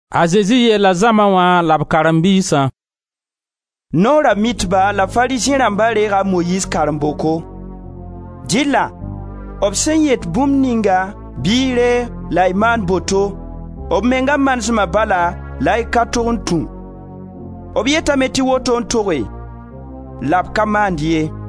A Zezi yeela zãma wã la b karen-biisã: «Noora Mitba la Farizẽ rãmba reega a Moyiiz karen-boko. Dɩlla b sẽn yet bũmb ninga bɩ y reeg la y maan boto, b menga manesma bala la y ka tog n tũ. B yetame tɩ woto n toge la b ka maand ye.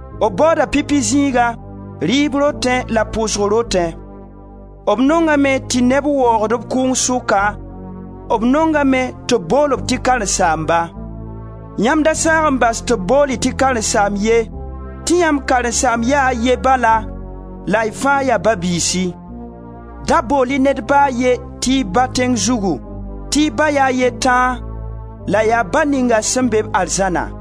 B baooda pipi zĩiga, rɩɩb rotẽ la pʋʋsg rotẽ. B nongame tɩ neb waoog-b kʋʋng sʋka, b nongame tɩ b bool-b tɩ karen-saamba. Yãmb da saag n bas tɩ b bool-y tɩ karen-saamb ye, tɩ yãmb karen-saamb ya a ye bala la y fãa yaa ba-biisi. Da bool-y ned ba a ye tɩ y ba tẽng zugu, tɩ y ba ya a ye tãa la yaa Ba ninga sẽn be-b arzãna.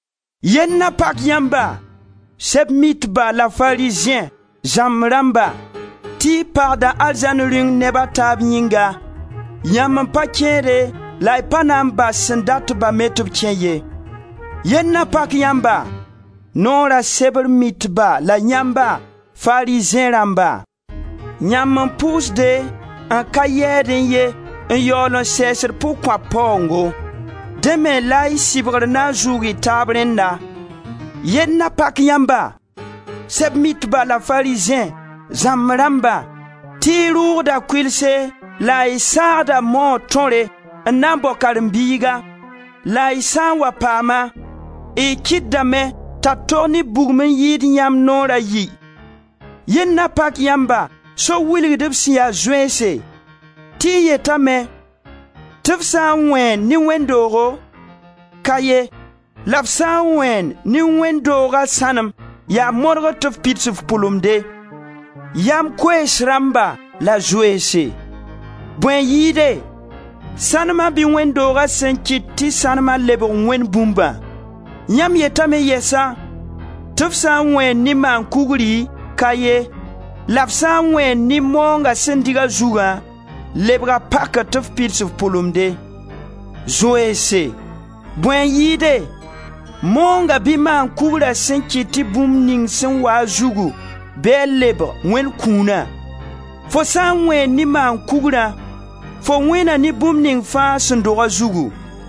Yell na pak yãmba, Sɛb-mitba la Farizẽ, zãmb rãmba, tɩ y pagda arzãn Rĩung neba taab yĩnga; yãmb n pa kẽede la y pa na n bas sẽn dat-ba me tɩ b kẽ ye. [ Yell na pak yãmba, Noora sebr mitba la yãmba, Farizẽ rãmba! Yãmb n pʋʋsde n ka yɛɛdẽ ye n yaool n sɛɛsd pʋg-kõap paoongo. Dẽ me la y sɩbgr na n zʋʋg y taab rẽnna.] Yell na pak yãmba, Sɛb-mitba la Farizẽ, zãmb rãmba, tɩ y rʋʋgda kʋɩlse la y saagda moog tõre n na n bao karen-biiga, la y sã n wa paam-a, y kɩtdame t'a tog ne bugum n yɩɩd yãmb naoor a yi. Yell na pak yãmba, so-wilgdb sẽn ya zoeense, tɩ y yetame tɩ f sã n wẽen ne wẽnd doogo, ka ye, la f sã n wẽen ne wẽnd dooga sãnem, yaa moodgr tɩ f pids f pʋlemde. Yam koees rãmba la zoeense, bõe n yɩɩde: sãnema bɩ wẽnd doogã sẽn kɩt tɩ sãnema lebg Wẽnd bũmbã? Yãmb yetame yɛsa tɩ f sã n wẽen ne maan-kugri, ka ye, la f sã n wẽen ne maoongã sẽn dɩg a zugã, lebga pakre tɩ f pids f pʋlemde. Zoeense, bõe n yɩɩde, maoongã bɩ maan-kugrã sẽn kɩt tɩ bũmb ning sẽn waa a zugu bɩ a lebg Wẽnd kũuna? Fo sã n wẽen ne maan-kugrã, fo wẽena ne bũmb ning fãa sẽn dog a zugu.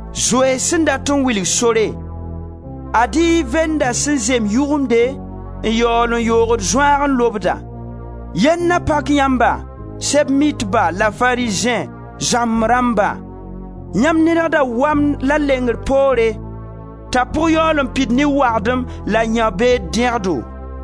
Zoeens sẽn dat n wilg sore, ad-y y venda sẽn zem yʋgʋmde n yaool n yoogd zõaag n lobda. Yell na pak yãmba, Sɛb-mitba la Farizẽ, zãmb rãmba, yãmb nedgda wamd la lengr poore, t'a pʋg yaool n pid ne wagdem la yão-beed dẽgdo.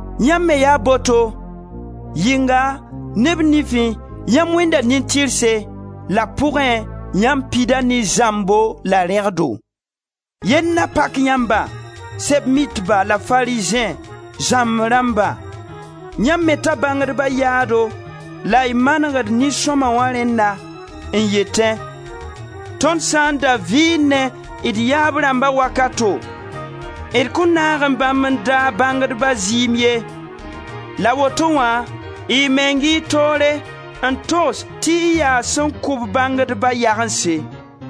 Yãmb me yaa boto: yɩnga, neb nifẽ, yãmb wẽnda nin-tɩrse, la pʋgẽ, yãmb pida ne zãmbo la rẽgdo. Yell na pak yãmba, Sɛb-mitba la Farizẽ, zãmb rãmba, yãmb meta bãngdba yaado la y manegd nin-sõma wã rẽnna, n yetẽ: ‹Tõnd sã n da vɩɩnẽ d yaab rãmba wakato, d kõn naagẽ bãmb n daag bãngdba zɩɩm ye.› La woto wã, y meng y toore n togs tɩ y yaa sẽn kʋ-b bãngdba yagense.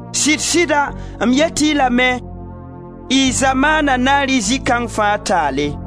Sɩd-sɩda, m yet-y lame, y zamaana na rɩ zɩ kãng fãa taale!